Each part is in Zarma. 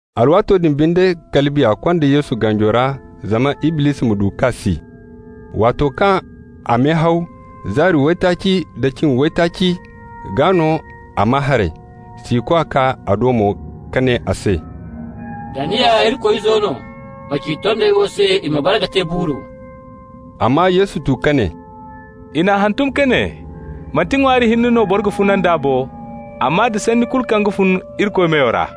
Alwaato din binde kala Biya konda Yesu ganjo ra zama Iblisi ma du k'a si. Waato kaŋ a mehaw zaari waytaaci da cin waytaaci, gaa no a maa haray. Siikwa kaa a do mo ka ne a se: «Da ni ya Irikoy Izo no, ma ci tondey wo se i ma bare ka te buuru.» Amma Yesu tu ka ne: «I n'a hantum ka ne: ‹Manti ŋwaari hinne no boro ga funa nd'a bo, amma da sanni kulu kaŋ ga fun Irikoy meyo ra.›»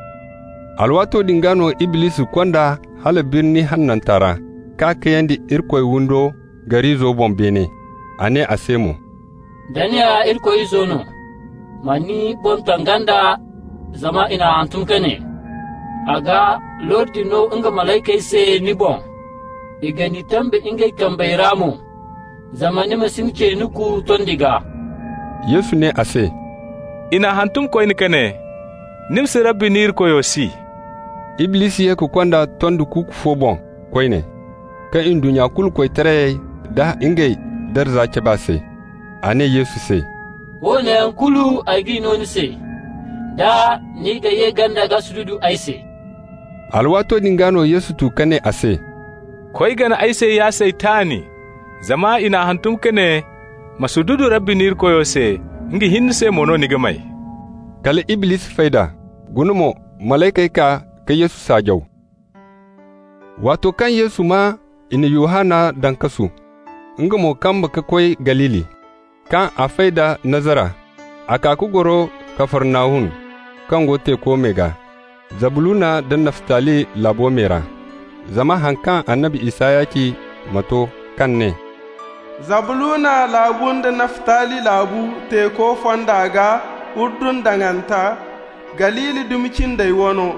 Alwaato din gaa no Iblisi kond'a hala birni hananta ra, k'a kayandi Irikoy windo gar'izo boŋ beene. A ne a se mo: «Da ni ya Irikoy Izo no, ma ni boŋ taŋ ganda, zama i n'a hantum ka ne: ‹A ga lordi no nga malaykey se ni boŋ, i ga ni tambe ngey kambey ra mo, zama ni ma si ni ce nuku tondi gaa.›» Yesu ne a se: «I n'a hantum koyne ka ne: ‹Ni ma si Rabbi ni Irikoyo si.›» Iblisi ye ka kond'a tondi kuuku fo boŋ koyne, ka ndunnya kulu koytarayey da ngey darza cab'a se. A ne Yesu se: «Woone yaŋ kulu ay g'i no ni se, da ni ga ye ganda ka sududu ay se.» Alwaato din gaa no Yesu tu ka ne a se: «Koy, gana ay se, ya Saytan! Zama i n'a hantum ka ne: ‹Ma sududu Rabbi ni Irikoyo se, nga hinne se mo no ni ga may.›» Kala Iblisi fay d'a. Guna mo, malaykey kaa ka Yesu saajaw. Waato kaŋ Yesu maa i na Yohanna daŋ kasu, nga mo kamba ka koy Galili. Kaŋ a fay da Nazara, a kaa ka goro Kafarnahum, kaŋ go teeko me gaa, Zabluna da Naftali laabu me ra, zama haŋ kaŋ annabi Isaya ci ma to kaŋ ne: «Zabluna laabu nda Naftali laabu, Teeko fonda gaa, Urdun daŋanta, Galili, dumi cindey wano: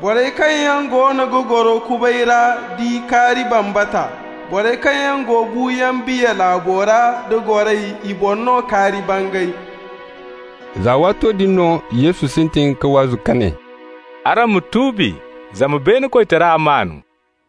Borey kaŋ yaŋ goono ga goro kubay ra di kaari bambata! Borey kaŋ yaŋ go buuyaŋ biya laabo ra da goray, i boŋ no kaari bangay.» Za waato din no Yesu sintin ka waazu ka ne: «Araŋ ma tuubi, zama beene koytara maan.»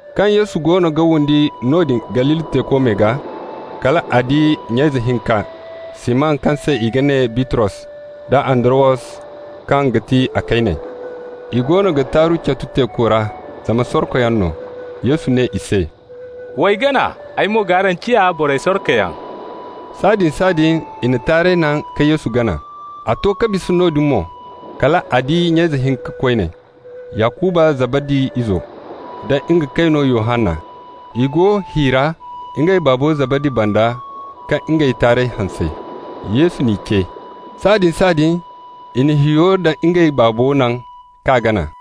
Kaŋ Yesu goono ga windi noodin Galili teeko me gaa, kal a di nya ize hinka, Siman kaŋ se i ga ne Bitros, da Andarawos, kaŋ ga ti a kayne. I goono ga taaru catu teeko ra, zama sorkoyaŋ no. Yesu ne i se: «W'ay gana, ay mo g'araŋ ciya borey sorkoyaŋ.» Sahãadin-sahãadin i na taarey naŋ ka Yesu gana. A to ka bisa noodin mo, kal a di nya ize hinka koyne, Yakuba Zabadi izo, da nga kayno Yohanna. I go hi ra ngey baabo Zabadi banda ka ngey taarey hanse. Yesu n'i ce. Sahãadin-sahãadin i na hiyo da ngey baabo naŋ, k'a gana.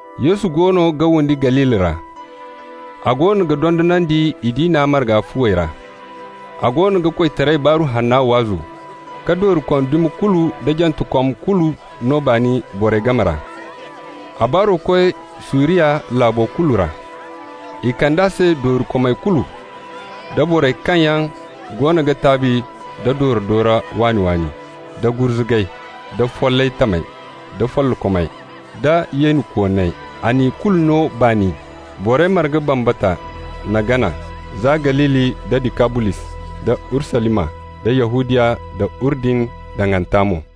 Yesu goono ga windi Galili ra. A goono ga dondonandi i diina marga fuwey ra. A goono ga koytaray Baaru Hanna waazu, ka doorikom dumi kulu da jantekom kulu no baani borey game ra. A baaro koy Suriya laabo kulu ra. I kand'a se doorikomey kulu, da borey kaŋ yaŋ goono ga taabi da doora-doora waani-waani da gurzugay, da follay tamey da follokomey, da yeenikooney. A n'i kulu no baani. Borey marga bambata n'a gana za Galili da Dikabolis da Urusalima da Yahudiya da Urdun daŋanta mo.